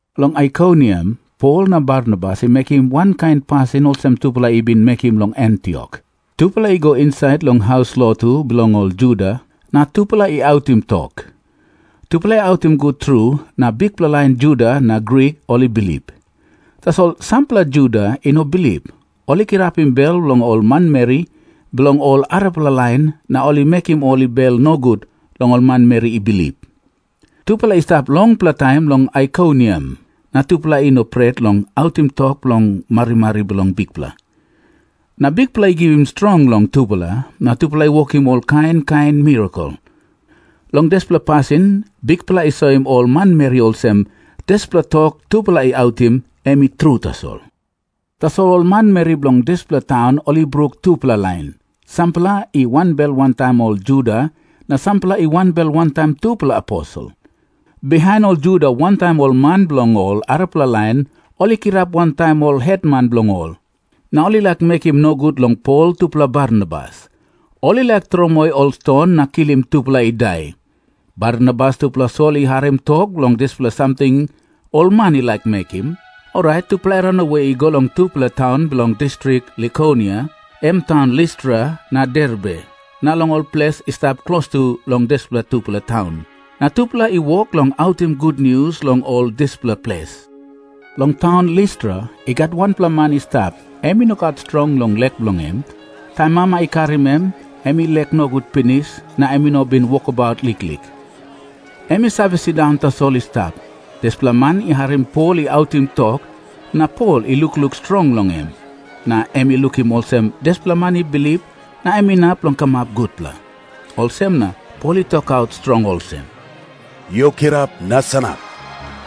Long Aikoniam Pol na Barnabas i mekim wankain pasin olsem tupela i bin mekim long Antiok. Tupela i go insait long haus lotu bilong ol Juda, na tupela i autim tok. Tupela i autim gut tru na bikpela lain Juda na Grik ol i bilip. Tasol sampela Juda i no bilip, ol i kirapim bel bilong ol manmeri bilong ol arapela lain, na ol i mekim ol i bel nogut long ol manmeri i bilip. Tupela i stap longpela taim long Aikoniam, na tupela i no pret long autim tok bilong marimari bilong Bikpela. Na Bikpela i givim strong long tupela, na tupela i wokim ol kain kain mirakel. Long dispela pasin Bikpela i soim ol manmeri olsem, dispela tok tupela i autim, em i tru tasol. Tasol ol manmeri bilong dispela taun ol i bruk tupela lain. Sampela i wanbel wantaim ol Juda, na sampela i wanbel wantaim tupela aposel. Bihain ol Juda wantaim ol man bilong ol arapela lain ol i kirap wantaim ol hetman bilong ol, na ol i laik mekim nogut long Pol tupela Barnabas. Ol i laik tromoi ol ston na kilim tupela i dai. Barnabas tupela Sol i harim tok long dispela samting ol man i laik mekim, orait tupela i ranawe i go long tupela taun bilong distrik Likonia, em taun Listra na Derbe, na long ol ples i stap klostu long dispela tupela taun. Na tupela i wok long autim gutnius long ol dispela ples. Long taun Listra i gat wanpela man i stap, em i no gat strong long lek bilong en. Taim mama i karim em, em i lek nogut pinis na em i no bin wokabaut liklik. Em i save sindaun tasol i stap. Dispela man i harim Pol i autim tok. Na Pol i lukluk strong long em, na em i lukim olsem dispela man i bilip na em inap long kamap gutpela. Olsem na Pol i tokaut strong olsem, “Yu kirap na sanap.”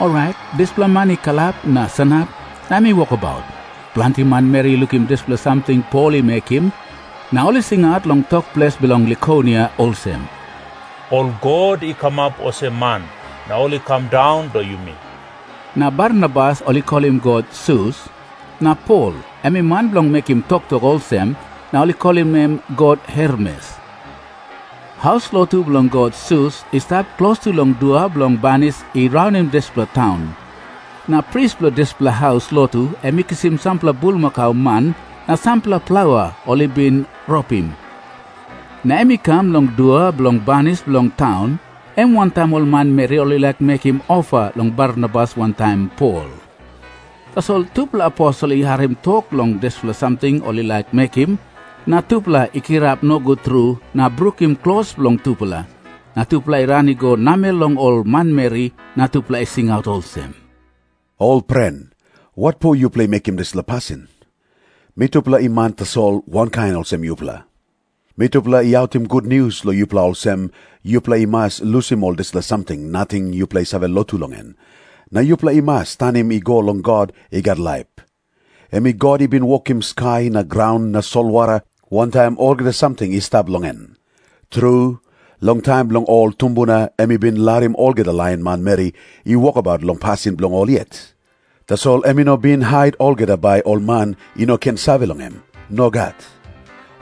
Orait dispela man i kalap na sanap na em i wokabaut. Planti manmeri i lukim dispela samting Pol i mekim, na ol i singaut long tok ples bilong Likonia olsem, “Ol god i kamap olsem man, na ol i kam daun long yumi.” Na Barnabas ol i kolim god Sus. Na Pol em i man bilong mekim toktok, olsem na ol i kolim em god Hermes. Haus lotu bilong god Sus i stap klostu long dua bilong banis i raunim dispela taun. Na pris bilong dispela haus lotu em i kisim sampela bulmakau man na sampela plaua ol i bin ropim, na em i kam long dua bilong banis bilong taun. Em wantaim ol manmeri ol i laik mekim ofa long Barnabas wantaim Pol. Tasol tupela aposel i harim tok long dispela samting ol i laik mekim, na tupela i kirap nogut tru na brukim klos bilong tupela. Na tupela i ran i go namel long ol manmeri na tupela i singaut olsem, “Ol pren, watpo yupela i mekim dispela pasin? Mitupela i man tasol, wankain olsem yupela. Mitupela i autim gutnius long yupela olsem, yupela i mas lusim ol dispela samting nating yupela i save lotu long en, na yupela i mas tanim i go long God i gat laip. Em God i bin wokim skai na graun na solwara, wantaim olgeta samting i stap long en. Tru, long taim bilong ol tumbuna em i bin larim olgeta lain manmeri i wokabaut long pasin bilong ol yet. Tasol em i no bin hait olgeta bai ol man i no ken save long em. Nogat.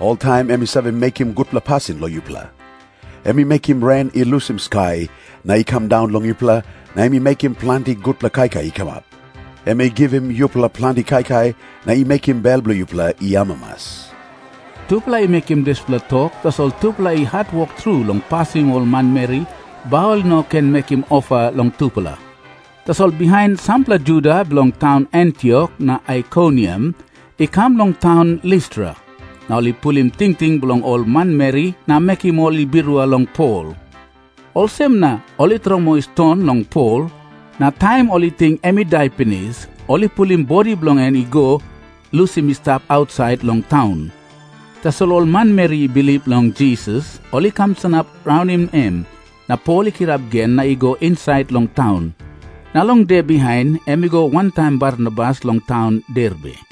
Oltaim em i save mekim gutpela pasin long yupela. Em i mekim ren i lusim skai na i kam daun long yupela, na em i mekim planti gutpela kaikai i kamap. Em i givim yupela planti kaikai na i mekim bel bilong yupela i amamas.” Tupela i mekim dispela tok, tasol tupela i hatwok tru long pasim ol manmeri, bai ol i no ken mekim ofa long tupela. Tasol bihain sampela Juda bilong taun Antiok na Aikoniam i kam long taun Listra, na ol i pulim tingting bilong ol manmeri na mekim ol i birua long Pol. Olsem na ol i tromoi ston long Pol. Na taim ol i ting em i dai pinis, ol i pulim bodi bilong en i go lusim i stap ausait long taun. Tasol ol manmeri i bilip long Jisas, ol i kam sanap raunim em, na Pol i kirap gen na i go insait long taun. Na long de bihain em i go wantaim Barnabas long taun Derbe.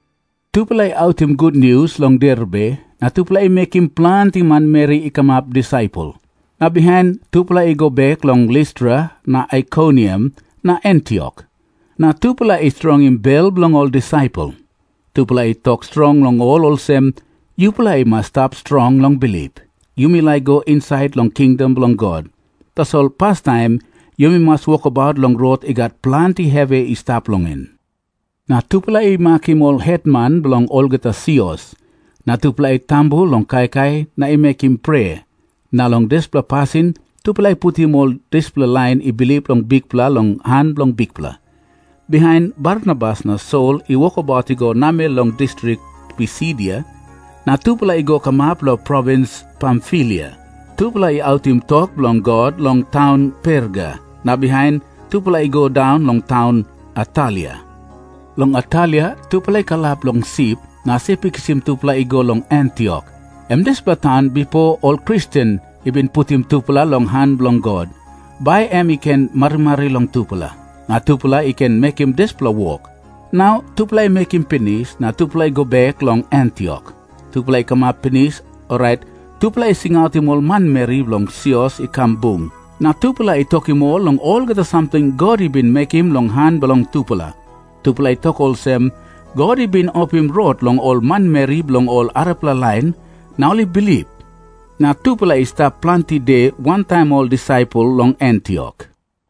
Tupela i autim gutnius long Derbe, na tupela i mekim planti manmeri i kamap disaipel. Na bihain tupela i go bek long Listra na Aikoniam na Antiok, na tupela i strongim bel bilong ol disaipel. Tupela i tok strong long ol olsem, “Yupela i mas i stap strong long bilip. Yumi laik i go insait long kingdom bilong God, tasol pastaim yumi mas wokabaut long rot i gat planti hevi i stap long en.” Na tupela i makim ol hetman bilong olgeta sios. Na tupela i tambu long kaikai na i mekim prea, na long dispela pasin tupela i putim ol dispela lain i bilip long Bikpela long han bilong Bikpela. Bihain Barnabas na Sol i wokabaut i go namel long distrik Pisidia, na tupela i go kamap long provins Pamfilia. Tupela i autim tok bilong God long taun Perga, na bihain tupela i go daun long taun Atalia. Long Atalia tupela i kalap long sip, na sip i kisim tupela i go long Antiok, em dispela taun bipo ol Kristen i bin putim tupela long han bilong God, bai em i ken marimari long tupela, na tupela i ken mekim dispela wok. Nau tupela i mekim pinis, na tupela i go bek long Antiok. Tupela i kamap pinis, orait tupela i singautim ol manmeri bilong sios i kam bung. Na tupela i tokim ol long olgeta samting God i bin mekim long han bilong tupela. Tupela i tok olsem, “God i bin opim rot long ol manmeri bilong ol arapela lain, na ol i bilip.” Na tupela i stap planti de wantaim ol disaipel long Antiok.